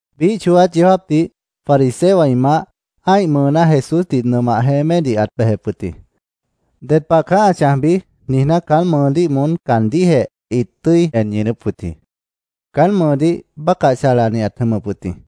Biíh chooát yeó jáapdih fariseowã ĩ maáh ã́ih mʉʉná Jesúsdih nʉmah jeémédih ãt bejep wʉt jĩ. “¿Ded pah caá ã chãjbi?” niijná, caán mʉʉdíh moón caandíhjeh ĩt tʉ́i en ñʉʉnʉ́p wʉt jĩ. Caán mʉʉdíh, bácah chalani ãt jʉmʉp wʉt jĩ.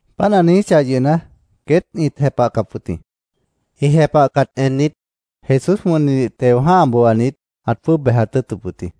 Páant ã niijíchah yʉhna, queét ĩt jepahcap wʉt jĩ. Ĩ jepahcat ennit, Jesús wʉnnidih teo jã́ha booanit, ãt jwʉ́ʉb bejat tʉ́ʉtʉp wʉt jĩ.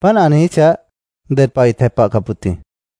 Páant ã niijíchah, ded pah ĩt jepahcap wʉt jĩ.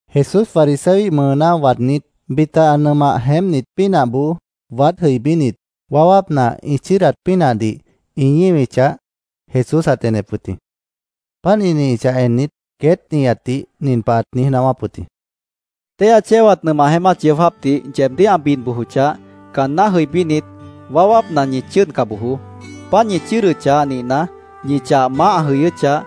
Jesús fariseoíh mʉʉná waadnít, bita ã nʉmah jeémpnit pínahboó waád jʉibínit, waáwápna ĩ chʉ́ʉdat pínahdih ĩ ñíwichah, Jesús ãt enep wʉt jĩ. Páant ĩ ñíwichah ennit, queét nihatdih nin pah ãt niíj naáwáp wʉt jĩ: —Téihya chéwat nʉmah jeémát yeó jáapdih yeebdíh ã bid bojochah, caanná jʉibínit, waáwápna ñi chʉ́ʉdca bojoó. Páant ñi chʉ́ʉdʉchah nihna, ñi chah maáh ã jʉyʉ́chah,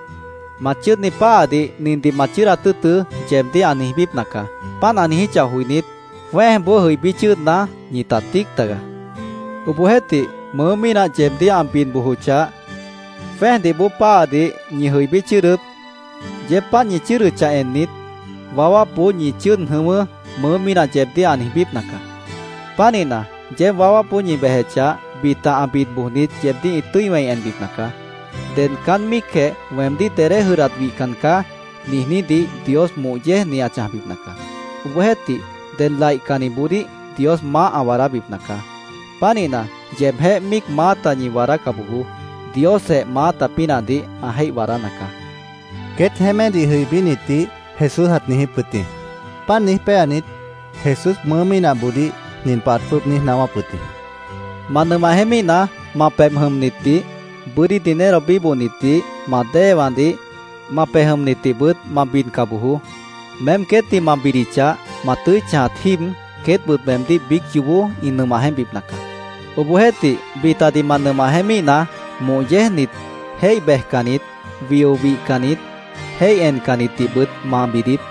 ‘Ma chʉ́ʉdni páhadih nindih ma chʉ́ʉdat tʉ́ʉtʉ́’, yeebdíh ã niijbípna caá. Páant ã niijíchah joinít, jwẽ́ejboó jʉibí chʉ́ʉdna, ñita tíic tagaá. Obohjeéhtih, mʉʉ́ mínah yeebdíh ã bid bojochah, jwẽ́ejdih bóo páhadih ñi jʉibí chʉ́ʉdʉ́p. Yeéb páant ñi chʉ́ʉdʉchah ennit, ‘Waáwápboó ñi chʉ́ʉd jʉ̃ʉ́wʉ́’, mʉʉ́ mínah yeebdíh ã niijbípna caá. Pánihna, yeéb waáwápboó ñi bejechah, bita ã bid bojnit yeebdíh ĩ tʉ́i wẽi enbipna caá. Ded caán míicjeh ‘Weemdíh dedé jʉdhdat wihcan caá’, niijnídih Dios moh yéejni ã chãjbipna caá. Obohjeéhtih, ded laihcanniboodíh Dios maáh ã waadábipna caá. Pánihna, yeebjéh míic maáta ñi waadáca bojoó. Diosjeh maáta pínahdih ã jéih waadána caá, queét jeémédih jʉibínitdih Jesús ãt niijíp wʉt jĩ. Páant niíj péanit, Jesús mʉʉ́ mínahboodíh nin pah ãt jwʉ́ʉb niíj naáwáp wʉt jĩ: —Ma nʉmah jeémíhna, ma pebh jʉmnitdih, bʉ́dí dinero bíbohnitdih, ma déewãdih, ma pej jʉmnitdihbʉt ma bidca bojoó. Meém queétdih ma bidichah, ma tʉ́i chãjat jíib, queétbʉt meemdíh biíc yoobó ĩ nʉmah jeémpbipna caá. Obohjeéhtih, bitadih ma nʉmah jeémíhna, moh yéejnit, jéih bejcannit, wio wihcannit, jéih encannitdihbʉt ma bidiíp.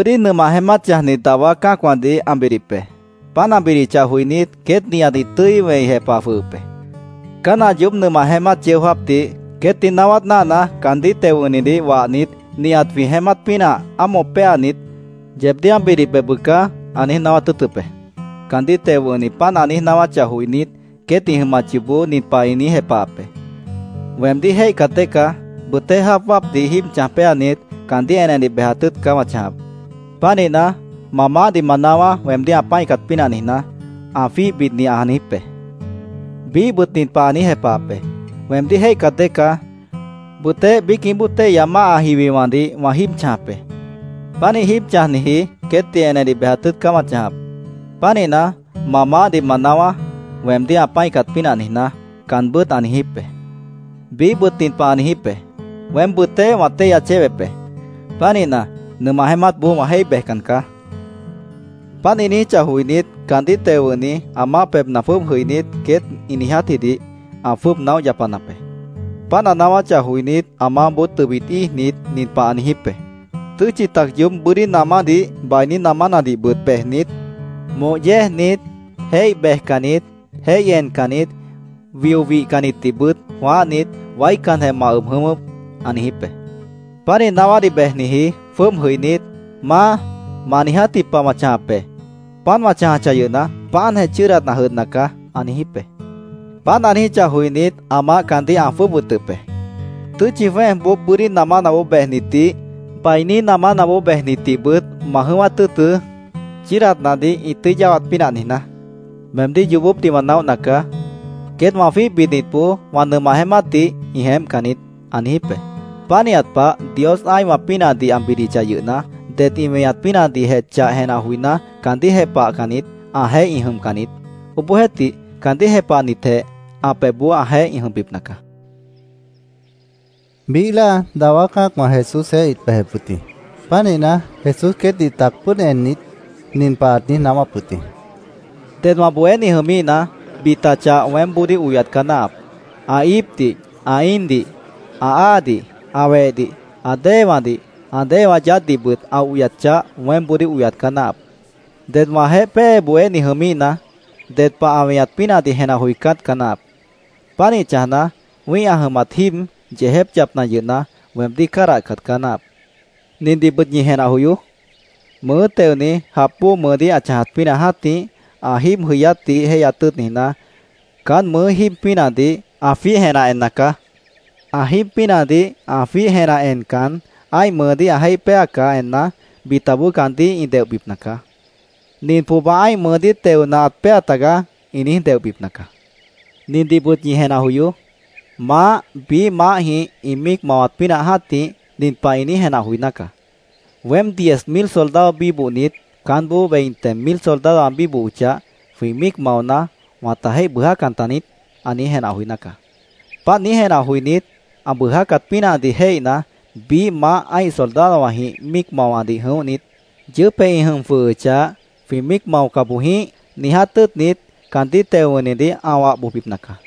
—Bʉ́dí nʉmah jeémát chãjni dawá cã́acwãdih ã bidip be. Páant ã bidichah joinít, queét nihat ĩ tʉ́i wẽi jepah jwʉhʉp be. Caán ã yoób nʉmah jeémát yeó jáapdih queétdih naáwát náahna, caandíh teo wʉ̃hnidih wahnit, ‘Nihat jwĩ jeémát pínahdih ámoh péanit, yeebdíh ã bidip be, bʉca’, ã niíj naáwát tʉ́ʉtʉp be. Caandíh teo wʉ̃hni páant ã niíj naáwáchah joinít, queét ĩ jʉmat yoobó nin pah ĩ niíj jepahap be: ‘Weemdíh jéihcat dée caá. Bʉtéh jáap wáapdih jíib chãj péanit, caandíh enedih bejat tʉ́ʉt caá wã chãjap. Pánihna, ma maáhdih ma naáwá, weemdíh ã pã́icat pínah niijná’, ã jwíih bidni ã niijíp be. Biíhbʉt nin pah ã niíj jepahap be: ‘Weemdíh jéihcat dée caá. Bʉtéh biícjĩh bóo téihya máha jiwiwãdih wã jíib chãjap be. Pánih jíib chãjniji queétdih enedih bejat tʉ́ʉt caá wã chãjap. Pánihna, ma maáhdih ma naáwá, weemdíh ã pã́icat pínah niijná’, caanbʉ́t ã niijíp be. Biíhbʉt nin pah ã niijíp be: ‘Weém bʉtéh wã téihya chéwep be. Pánihna, nʉmah jeémátboó wã jéih bejcan caá’, ã niijíp be. Páant ĩ niijíchah joinít, caandíh teo wʉ̃hni ã maáh pebhna jwʉ́ʉb jʉinít, queét ĩ niijátjidih ã jwʉ́ʉb naóh yapanap be. Páant ã naáwáchah joinít, ã maáhboó tʉbit íijnit, nin pah ã niijíp be: ‘Tʉ́tchi tac yoób bʉ́dí namánadih, bainí namánadihbʉt bejnit, moh yéejnit, jéih bejcannit, jéih encannit, wio wihcannitdihbʉt jwãáhnit, waícanjeh ma ʉb jʉ̃ʉ́wʉ́p’, ã niijíp be. Pánih naáwádih bejniji jwʉ́ʉb jʉinít, ‘Maá, ma niijátji pah wã chãjap be. Páant wã chãjachah yʉhna, páantjeh chʉ́ʉdat ã jʉdhna caá’, ã niijíp be. Páant ã niijíchah joinít, ã maáh caandíh ã jwʉ́ʉb wʉtʉp be. ‘Tʉ́tchi jwẽ́ejboó bʉ́dí namánaboó bejnitdih, bainí namánaboó bejnitdihbʉt ma jʉ̃ʉ́wát tʉ́ʉtʉ́, chʉ́ʉdatnadih ĩ tʉ́i yáwat pínah niijná. Meemdíh yoobópdih wã naóhna caá. Queét wã jwíih bidnitboó wã nʉmah jeémátdih ĩ jeémpcan niít’, ã niijíp be. Pánihat pah, Dios ã́ihwã pínahdih ã bidichah yʉhna, det ĩ weñat pínahdihjeh chah jenah joiná, caandíh jepahcannit, ãjeéh ĩ jʉmcan niít. Obohjeéhtih, caandíh jepahnitjeh ã pebhboó ãjeéh ĩ jʉmbipna caá, Jesús ãt niijíp wʉt jĩ. Biíh láa dawá cã́acwã Jesúsjeéh ĩt bejep wʉt jĩ. Pánihna, Jesús queétdih tac pʉ́ʉd ennit, nin pah ãt niíj naáwáp wʉt jĩ: “Ded wã bohéni jʉmíhna, bita chah weémboodíh oyat caá náahap. Ã íipdih, ã íindih, ã áadih, ã wehdih, ã déewãdih, ã déewã yaádhdihbʉt ã oyat chah weémboodíh oyat caá náahap. Ded wãjeéh pée bohéni jʉmíhna, ded pah ã weñat pínahdih jenah joicát caá náahap. Pánih chãjna, wĩ́ih ã jʉmat jíib yeejép yapna yʉhna, weemdíh cádahcat caá náahap. Nindihbʉt ñi jenah joyoó: Mʉʉ́ teoni jap bóo mʉʉdíh ã chãjat pínah jã́tih, ã jíib jʉyátdih jéihyat tʉ́ʉt niijná, caán mʉʉ́ jíib pínahdih ã jwíih jenah enna caá. Ã jíib pínahdih ã jwíih jenah encan, ã́ih mʉʉdíh ã jéih péacah enna, bitaboó caandíh ĩ deohbipna caá. ‘Nin pohba ã́ih mʉʉdíh teona, ãt péa tagaá’, ĩ niíj deohbipna caá. Nindihbʉt ñi jenah joyoó: Maáh biíh maáhjĩh ĩ míic mawat pínah jã́tih, nin pah ã niíj jenah joiná caá: ‘¿Weém diez mil soldadowã bíbohnit, caánboó veinte mil soldadowã ã bíbohochah, jwĩ míic maona, wãta jéih bʉʉjá taniít?’ ã niíj jenah joiná caá. Páant niíj jenah joinít, ã bʉʉjácat pínahdih jéihna, biíh maáh ã́ih soldadowãjĩh míic mawadih jʉ̃óhnit, yʉʉ́pjeh ĩ jʉm jwʉhʉchah, ‘Jwĩ míic maoca boj jĩíh’, niiját tʉ́ʉtnit, caandíh teo wʉ̃hnidih ã wah bojbipna caá.